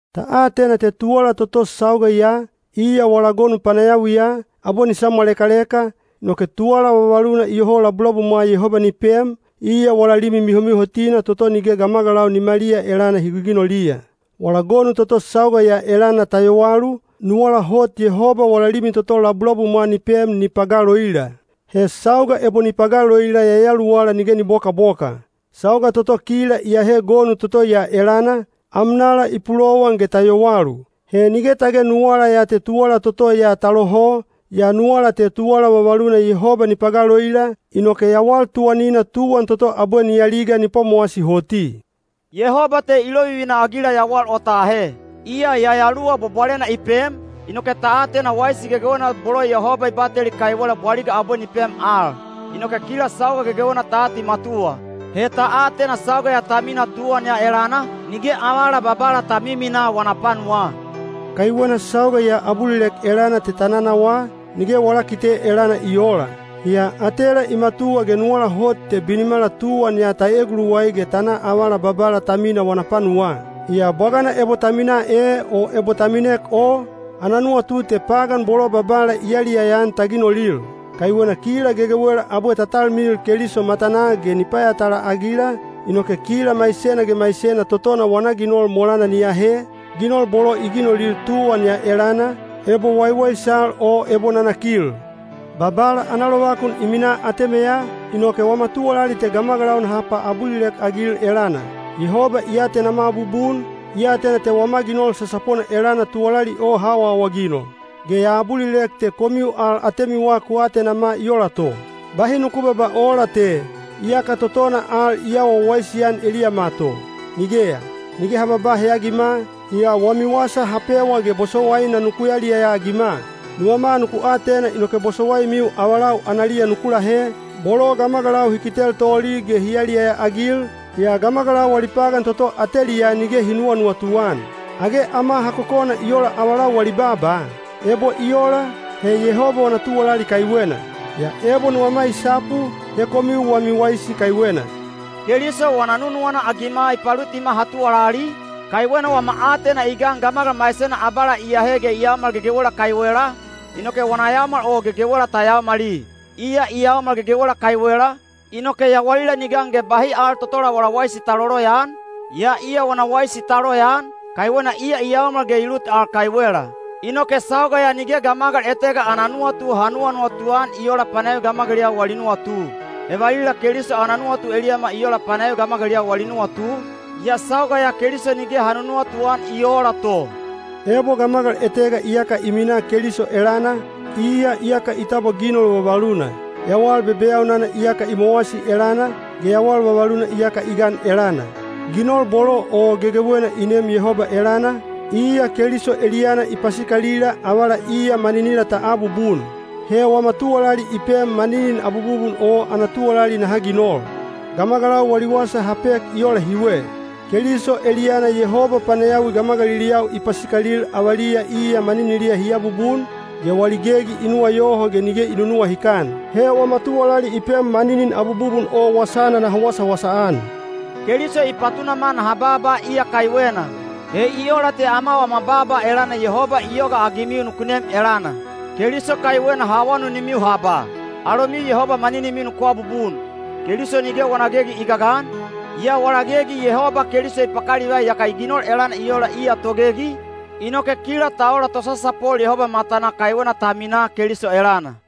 Ta atena te tuwala toto sauga ya, iya wala gonu panayawiya, abwe ni samwalekaleka, inoke tuwala vavaluna iyoho labulabumwa Yehoba ni pem, iya wala limi mihomihotina toto nige gamagalau nimaliya elana hi giginoliya. Wala gonu toto sauga ya elana ta yowalu, nuwala hot Yehoba wala limi toto labulabumwa ni pem ni pagaloila. He sauga ebo ni pagaloila yayaluwala nige ni bobokaboka. Sauga toto kila iyahe gonu toto ya elana, amnala i pulowan ge ta yowalu. He nige tage nuwala ya te tuwala toto ya ta loho, yaa nuwala te tuwala vavaluna Yehoba ni pagaloila, inoke yawal tuwanina tuwan toto abwe ni aliga ni pwamowasi hoti. Yehoba te i lovivina-agila yawal o ta ahe. Iya Yayaluwa Bwabwalena i pem, inoke ta atena waisi gegewena bolo Yehoba i bateli kaiwela bwaliga abwe ni pem al. Inoke kila sauga gegewena ta atimatuwa. He ta atena sauga ya ta minaa tuwan ya elana, nige avala Babala ta miminaa wana panuwaa. (Kaiwena sauga ya abulilek elana te ta nanawaa, nige wala kite elana i oola.) Yaa atela i matuwa ge nuwala hot te binimala tuwan ya ta eguluwai ge ta na avala Babala ta minaa wana panuwaa. Yaa bwagana ebo ta minaa e o ebo ta minek o, ana nuwatu te pagan bolo Babala i yaliyaya-an ta ginolil. Kaiwena kila gegewela abwe ta talmilil Keliso matanaa ge ni payatala-agila, inoke kila maisena ge maisena totona wana ginol molana ni ahe, ginol bolo i ginolil tuwan ya elana, ebo waiwaisal o ebo nanakil. Babala ana lovakun i minaa atemeya, inoke wama tuwalali te gamagalau naha paabulilek-agil elana. Yehoba i atenama bubun, i atena te wama ginol sasapona elana tuwalali o ha awaawaginol. Ge ya abulilek te komiu al atemiwa ku atenama i ola to. Bahi nuku babaa oola te, “Iyaka totona al i awa wawaisi-an eliyama to.” Nigeya! Nige ha babaa heyagima, yaa wami wasa ha pewa ge bosowaina nuku yaliyaya-agima. Nuwama nuku atena inoke bosowaimiu avalau analiya nuku lahe, bolo gamagalau hi kitel toli ge hi yaliyaya-agil, yaa gamagalau wali pagan toto ateliyaa nige hi nuwanuwatu-an. Age ama ha kokona i ola avalau wali baaba? Ebo i ola, he Yehoba wana tuwalali kaiwena. Yaa ebo nuwama i sapu, he komiu wami waisi kaiwena. Keliso wana nunuwana-agima i palutima ha tuwalali, kaiwena wama aatena i gan gamagal maisena abala i ahe ge i yaomal gegewela kaiwela, inoke wana yaomal o gegewela ta yaomali. Iya i yaomal gegewela kaiwela, inoke yawalila ni gan ge bahi al totola wala waisi ta loloyaan, yaa iya wana waisi ta loyaan, kaiwena iya i yaomal ge i lut al kaiwela. Inoke sauga ya nige gamagal etega ana nuwatu ha nuwanuwatu-an i oola panayawi gamagaliliyau wali nuwatu. He valila Keliso ana nuwatu eliyama i ola panayawi gamagaliliyau wali nuwatu, yaa sauga ya Keliso nige ha nunuwatu-an i oola to. Ebo gamagal etega iyaka i minaa Keliso elana, iya iyaka i tabwa ginol vavaluna; yawal bebeyaunana iyaka i mowasi elana, ge yawal vavaluna iyaka i gan elana. Ginol bolo o gegewena i neem Yehoba elana, iya Keliso eliyana i pasikalila avala iya maninila ta abubun. He wama tuwalali i pem maninin abububun o ana tuwalali naha ginol. Gamagalau wali wasa ha pek i ola hiwe: Keliso eliyana Yehoba panayawi gamagaliliyau i pasikalil avaliya iya maniniliya hi abubun, ge wali gegi i nuwayoho ge nige i nunuwahikan. He wama tuwalali i pem maninin abububun o wasana naha wasawasa-an. Keliso i patunama naha baaba iya kaiwena. He i ola te ama wama baaba elana Yehoba i yogaagimiu nuku nem elana. Keliso kaiwena ha awanunimiu ha ba, “Alomiu Yehoba maninimiu nuku abubun.” Keliso nige wana gegi i gagan, yaa wala gegi Yehoba Keliso i pakalivai yaka i ginol elana i ola iya togegi, inoke kila ta ola tosasapol Yehoba matanaa kaiwena ta minaa Keliso elana.